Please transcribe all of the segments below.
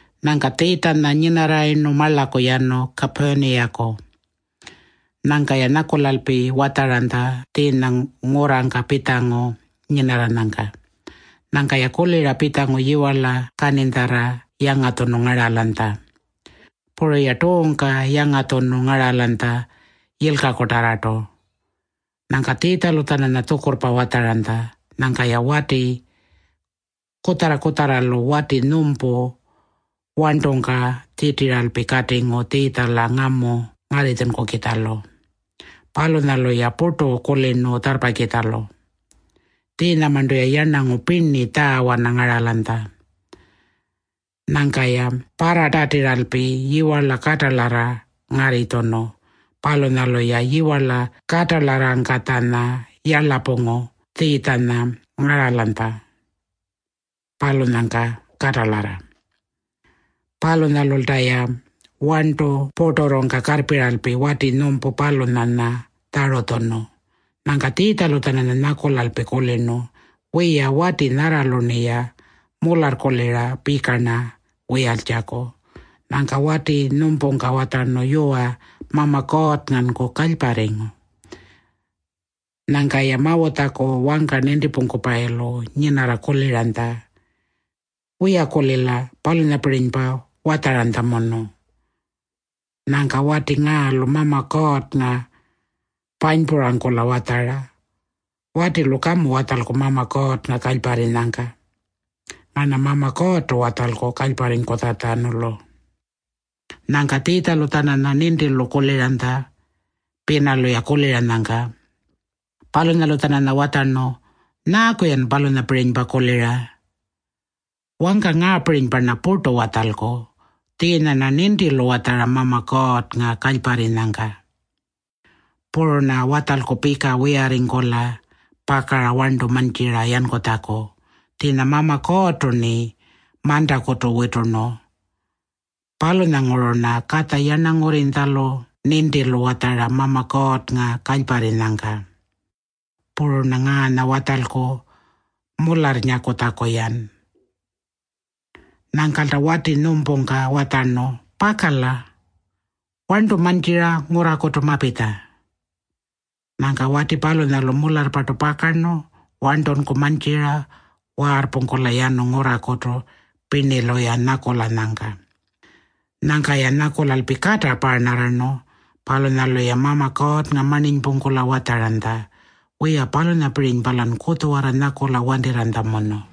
Nyangka Tjiitjanya nyinarrayirnu marlaku yanu Kapurniyaku. Nyangka-ya nyakulalpi watjaranytja tjiinya ngurrangka pitjangu nyinarranyangka. Nyangka-ya kulira pitjangu yiwarla kaninytjarra yangatjunu ngaralanytja. Puru-ya tuungka yangatjunu ngaralanytja yilkakutarrartu. Nyangka Tjiitjalu-tjananya tjukurrpa watjaranytja. Nyangka-ya wati kutjarra-kutjarralu wati nyumpu warntungka tjitira katingu Tjiitjala ngamu ngarritjunkukitjalu. Palunyalu-ya purtu kulirnu tjarrpakitjalu. Tjiinyamarntu-ya yarnangu pirni tjaawana ngaralanytja. Nyangka-ya parratatiralpi yiwarla katalarra ngarritjunu. Palunyalu-ya yiwarla katalarrangkatjanya yarlapungu Tjiitjanya ngaralanytja, palunyangka katalarra. Palunyalulta-ya warntu purturrungka karrpiralpi wati nyumpu palunyanya tjarutjunu. Nyangka Tjiitjalu-tjananya nyakulalpi kulirnu, “Wiya, wati nyarralu-rniya mularrkulira pika-rna wiyaltjaku.” Nyangka wati nyumpungka watjarnu, “Yuwa, Mama Kuurrnganku kalyparringu.” Nyangka-ya Mawutjaku wangka nintipungkupayilu nyinarra kuliranytja, “Wiya-kulila palunyapirinypa watjaranytjamunu. Nyangka wati ngaalu Mama Kuurrnga panypurangkula watjara. Watilu kamu watjalku Mama Kuurrnga kalyparrinyangka. Ngarna Mama Kuurrtu watjalku kalyparringkutjatjanulu.” Nyangka Tjiitjalu-tjananya nintilu kuliranytja pinalu-ya kuliranyangka. Palunyalu-tjananya watjarnu, “Nyaaku-yan palunyapirinypa kulira? Wangka nyaapirinypa-rna purtu watjalku? Tjiinya-rna nintilu watjara Mama Kuurrnga kalyparrinyangka. Puru-rna watjalku pika wiyarringkula pakara warntu mantjira yankutjaku. Tjiinya Mama Kuurrtu-rni mantakutu witurnu. Palunyanguru-rna Katja Yarnangurrinytjalu nintilu watjara Mama Kuurrnga kalyparrinyangka. Puru-rna ngaanya watjalku mularrnyakutjaku-yan.” Nyangkalta wati nyumpungka watjarnu, “Pakala. Warntunku mantjira ngurrakutu mapitja.” Nyangka wati palunyalu mularrpartu pakarnu warntunku mantjira waarrpungkula yanu ngurrakutu pirnilu-ya nyakulanyangka. Nyangka-ya nyakulalpi kata paarnarrarnu. Palunyalu-ya Mama Kuurrnga marninypungkula watjaranytja, “Wiya, palunyapirinypa-lan kutjuwarra nyakula wantirranytjamunu.”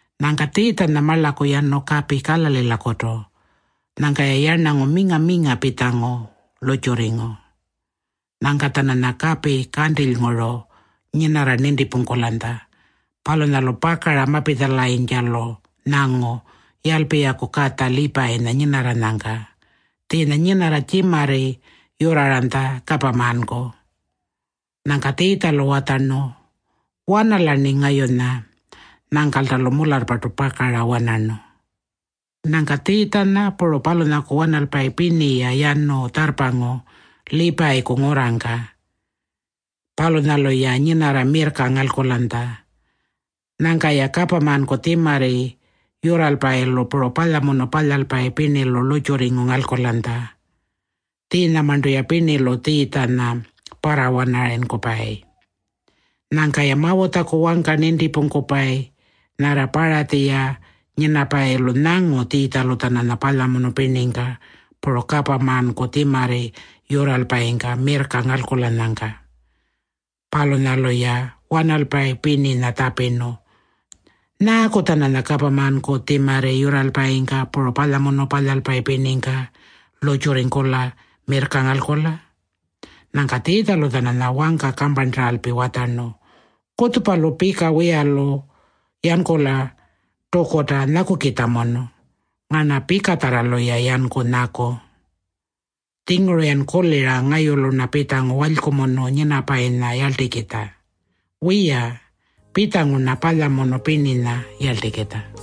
Nyangka Tjiitjanya marlaku yanu kapi Kalalilakutu. Nyangka-ya yarnangu minga-minga pitjangu lurrtjurringu. Nyangka-tjananya kapi kantilynguru nyinarra nintipungkulanytja. Palunyalu pakara mapitjalayintjalu nyangu Yalpiyaku katja Liipayinya nyinarranyangka. Tjiinya nyinarra tjimarri yurraranytja kapamanku. Nyangka Tjiitjalu watjarnu, “Wanala-rni ngayunya.” Nyangkalta-lu mularrpartu pakara wanarnu. Nyangka Tjiitjanya puru palunyaku wanalpayi pirni-ya yanu tjarrpangu Liipayiku ngurrangka. Palunyalu-ya nyinarra mirrka ngalkulanytja. Nyangka-ya kapamanku tjimarri yurralpayilu puru palyamunu palyalpayi pirnilu lurrtjurringu ngalkulanytja. Tjiinyamarntu-ya pirnilu Tjiitjanya parrawanarayinkupayi. Nyangka-ya Mawutjaku wangka nintipungkupayi nyarra Paratji-ya nyinapayilu nyangu Tjiitjalu-tjananya palyamunu pirningka puru kapamanku tjimarri yurralpayingka mirrka ngalkulanyangka. Palunyalu-ya wanalpayi pirninya tjapirnu, “Nyaaku-tjananya kapamanku tjimarri yurralpayingka puru palyamunu palyalpayi pirningka lurrtjurringkula mirrka ngalkula?” Nyangka Tjiitjalu-tjananya wangka kamparntaralpi watjarnu, “Kutjupalu pika wiyalu yankula tukuta nyakukitjamunu. Ngarna pikatjarralu-ya yanku nyaku. Tjinguru-yan kulira ngayulu-rna pitjangu walykumunu nyinapayinya yarltikitja. Wiya, pitjangu-rna palyamunu pirninya yarltikitja.”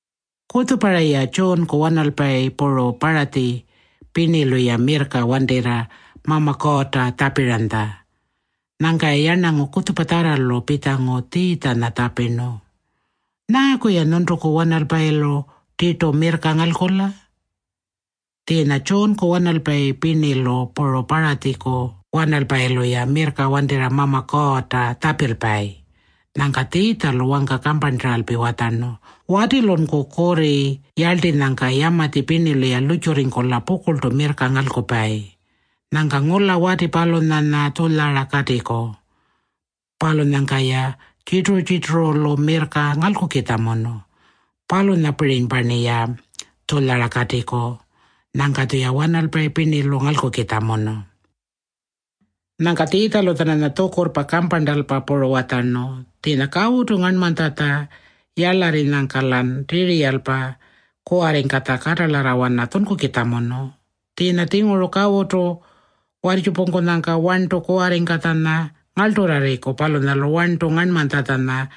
Kutjupayara-ya Tjuunku wanalpayi puru Paratji pirnilu-ya mirrka wantirra Mama Kuurrta tjapiranytja. Nyangka-ya yarnangu kutjupatjarralu pitjangu Tjiitjanya tjapirnu, “Nyaaku-ya nyuntuku wanalpayilu tirtu mirrka ngalkula? Tjiinya Tjuunku wanalpayi pirnilu puru Paratjiku wanalpayilu-ya mirrka wantirra Mama Kuurrta tjapilpayi.” Nyangka Tjiitjalu wangka kamparntaralpi watjarnu, “Watilunku kurri yarltinyangka yamatji pirnilu-ya lurrtjurringkula pukurltu mirrka ngalkupayi. Nyangka ngula wati palunyanya tjulyara katiku. Palunyangka-ya tjirturu-tjirturulu mirrka ngalkukitjamunu. Palunyapirinypa-rniya tjulyara katiku. Nyangka-tjuya wanalpayi pirnilu ngalkukitjamunu.” Nyangka Tjiitjalu-tjananya tjukurrpa kamparntalpa puru watjarnu, “Tjiinya kawutu ngarnmanytjatja yarlarrinyangka-lan tiriyalpa kuwarringkatja katalarrawana tjunkukitjamunu. Tjiinya-tjinguru kawutu warrtjupungkunyangka warntu kuwarringkatjanya ngarlturrarriku palunyalu warntu ngarnmanytjatjanya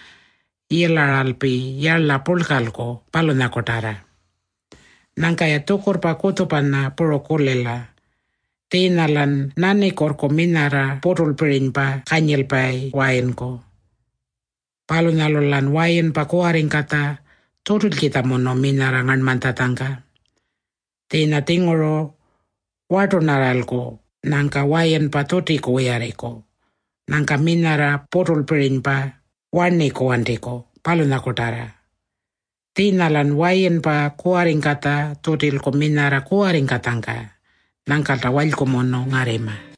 yilaralpi yarla purlkalku, palunyakutarra. Nyangka-ya tjukurrpa kutjupanya puru kulila. Tjiinya-lan nanikuurrku minyarra puturlpirinypa kanyilpayi wayinku. Palunyalu-lan wayinpa kuwarringkatja tjutilkitjamunu minyarra ngarnmanytjatjangka. Tjiinya-tjinguru wartunarralku nyangka wayinpa tjutiku wiyarringku. Nyangka minyarra puturlpirinypa warniku wantiku, palunyakutarra. Tjiinya-lan wayinpa kuwarringkatja tjutilku minyarra kuwarringkatjangka. Nyangkalta walykumunu ngarrima.”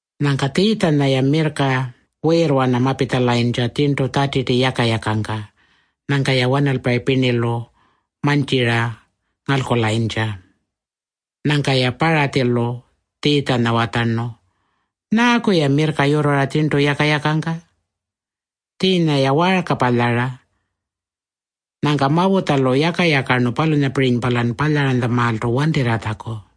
Nyangka Tjiitjanya-ya mirrka wiirwana mapitjalayintja tjirntu Tjatiti yaka-yakangka. Nyangka-ya wanalpayi pirnilu mantjira ma-ngalkulayintja. Nyangka-ya Paratjilu Tjiitjanya watjarnu, “Nyaaku-ya mirrka yurrara tjirntu yaka-yakangka? Tjiinya-ya waarka palyara. Nyangka Mawutjalu yaka-yakarnu palunyapirinypa-lan palyantjamaaltu wantirratjaku.”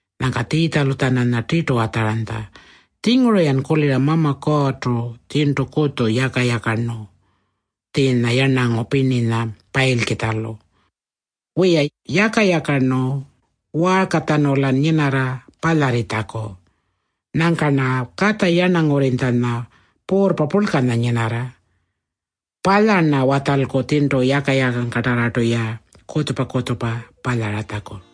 Nyangka Tjiitjalu-tjananya tirtu watjaranytja, “Tjinguru-yan kulira Mama Kuurrtu tjirntu kutju yaka-yakarnu tjiinya yarnangu pirninya payilkitjalu. Wiya, yaka-yakarnu waarkatjanu-lan nyinarra palyarritjaku. Nyangka-rna Katja Yarnangurrinytjanya puurrpa purlkanya nyinarra. Palya-rna watjalku tjirntu yaka-yakangkatarrartu-ya kutjupa-kutjupa palyaratjaku.”